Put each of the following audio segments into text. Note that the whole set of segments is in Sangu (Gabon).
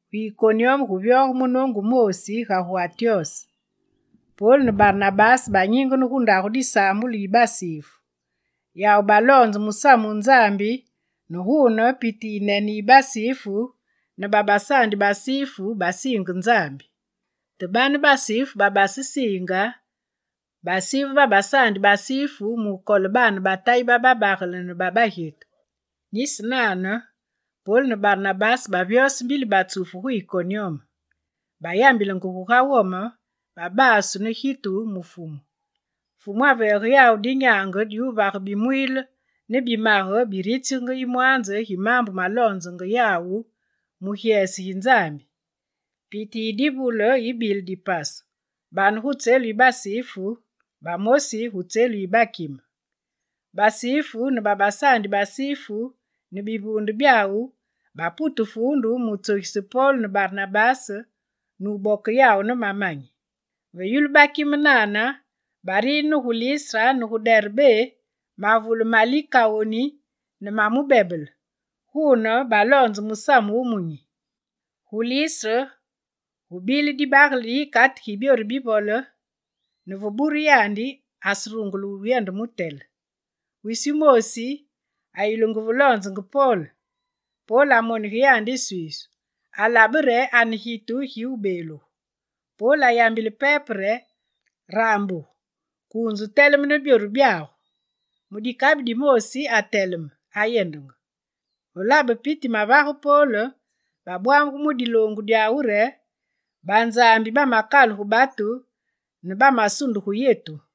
Gu Ikonyume gu vyoge munoongu wumoosi ga gu Antyose: Pol ne Barnabase banyingene gu ndagu disaambulu yi basifu. Yawu baloonze musamu wu Nzambi ne guune piti yiyinene yi basifu ne babasaandi basifu basiinge Nzambi. Te bane basifu babasesiinge basive babasaandi basifu mukole baane ba Tayi bababagele ne babagyetu. Nisi nane, Pol ne Barnabase bavyose mbili batsufu gu Ikonyume. Bayambilenge guga wome, babasu ne gitu mu Fumu. Fumu aveege yawu dinyaange diwuvage bimwiile ne bimage biritsigenge yimwanze gi maambu maloonzenge yawu mu gyese gi Nzambi. Piti yi divule yibile dipasu: bane gu tselu yi basifu, bamosi gu tselu yi bakime. Basifu ne babasaandi basifu ne bivuunde byawu, bapute fuundu mutsogise Pol ne Barnabase nuboke yawu ne mamanyi. Ve yulu bakime nane, bariine ne gu Listre ne gu Derbé, mavule ma Likawoni ne ma mubebele. Guune baloonze musamu wumunyi. Gu Listre, gubile dibagele di yikate gi byoru bivole, ne ve buru yandi aserungule wuyende mutele. Wisi wumoosi ayulungu ve loonzenge Pol. Pol amonige ya iswiisu, alabe re ane gitu gi wubeeluge. Pol ayambile pepe re: «Raambuge, kuunze wuteleme ne byoru byagu!» Mu dikabi dimoosi ateleme, ayendenge. Ve labe piti mavage Pol, babwamugu mu diloongu dyawu re: «Banzambi bamakalugu batu ne bamasunde gu yetu!»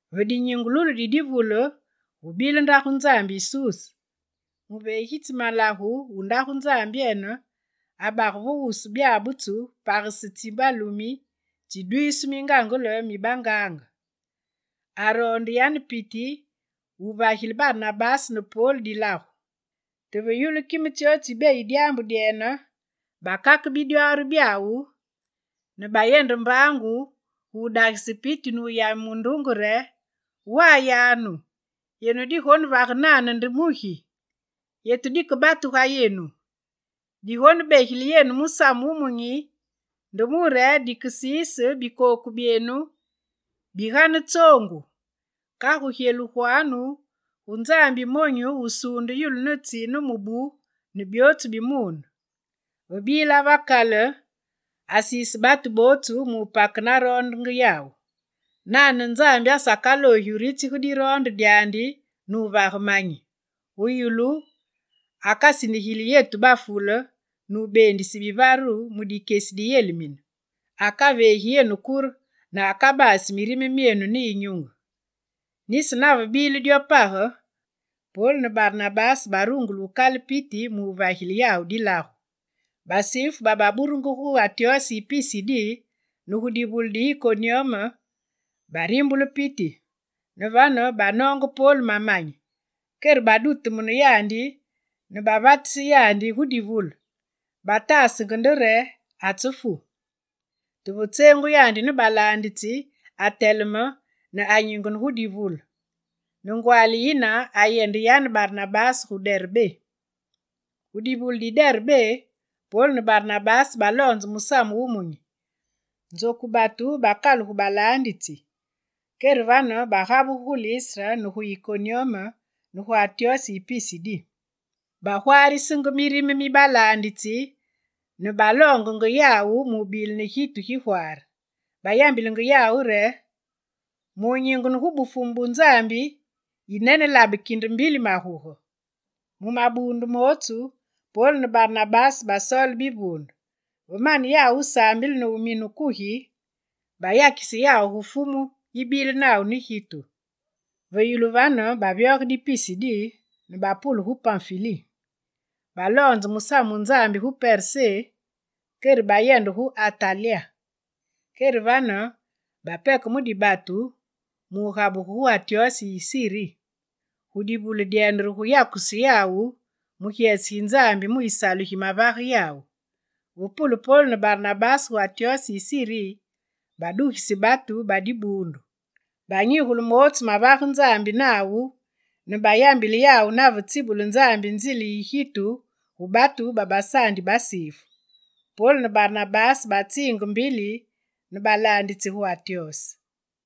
Ve dinyingululu di divule gubile ndagu nzambi yi Suse. Muveegitsi malagu wu ndagu nzambyene abage ve wusu byabutsu, bapagese tsi balumi tsidwisu mingaangele mi bangaange. Aroonde yane piti wuvagile Barnabase ne Pol dilagu. Te ve yulu kime tsyootsu tsibeyi dyaambu dyene, bakake bidwaari byawu ne bayende mbaangu gu dagise piti nuyame munduunge re: «Wayanu, yenu digonevage nane nde mugi? Yetu dike batu ga yenu! Digonebegile yenu musamu wumunyi, nde mure dikesiise bikooku byene bigane tsoongu. Kagu gyeluganu gu Nzambi yi monyu, wusuunde yulu, ne tsi, ne mubu, ne byootsu bi muune. Ve bila ve kale, asiise batu bootsu mu wupake naroondenge yawu. Nane Nzambi asakaloogi wuritsige diroonde dyandi nuvaga manyi: gu yulu, akasindigili yenu bafule nubeendise bivaru mu dikyesi diyelimine. Akaveegi yenu kure ne akabasi mirime myenu ne yinyunge.» Nisi nave bile dyo page, Pol ne Barnabase barungule wukale piti mu wuvagile yawu dilagu. Basifu baburugenge gu Antyose yi Pisidi ne gu divule di Ikonyume, barimbule piti. Ne vane, banoonge Pol mamanyi, kere badutumune yandi ne bavatise yandi gu divule, bataasenge nde re atsefu. Te ve tseengu yandi ne balaanditsi ateleme ne anyingene gu divule. Ne ngwaali yine ayende yane Barnabase gu Derbé. Gu divule di Derbé, Pol ne Barnabase baloonze Musamu wu Munyi. Nzoku batu bakalugu balaanditsi. Kere vane bagabugu gu Listre ne gu Ikonyume ne gu Antyose yi Pisidi. Bagwaarisenge mirime mi balaanditsi ne baloongenge yawu mubile ne gitu gigwaare. Bayambile yawu re: «Mu nyingene gu Bufumu bu Nzambi, yinene labe kinde mbili maguge.» Mu mabuundu mootsu, Pol ne Barnabase basoole bivuunde; ve mane yawu wusaambile ne wumine kugi, bayakise yawu gu Fumu yibile nawu ne gitu. Ve yulu vane, bavyoge di Pisidi ne bapule gu Panfili. Baloonze musamu wu Nzambi gu Persé kere bayende gu Atalya. Kere vane bapeke mu dibatu mugabugu gu Antyose yi Siri. Gu divule dyene re gu yakusu yawu mu gyese gi Nzambi mu yisalu gimavage yawu. Ve pule Pol ne Barnabase gu Antyose yi Siri, badugise batu ba dibuundu. Banyigule mootsu mavage Nzambi nawu ne bayambile yawu nave tsibule Nzambi nzile yi gitu gu batu babasaandi basifu. Pol ne Barnabase batsiinge mbili ne balaanditsi gu Antyose.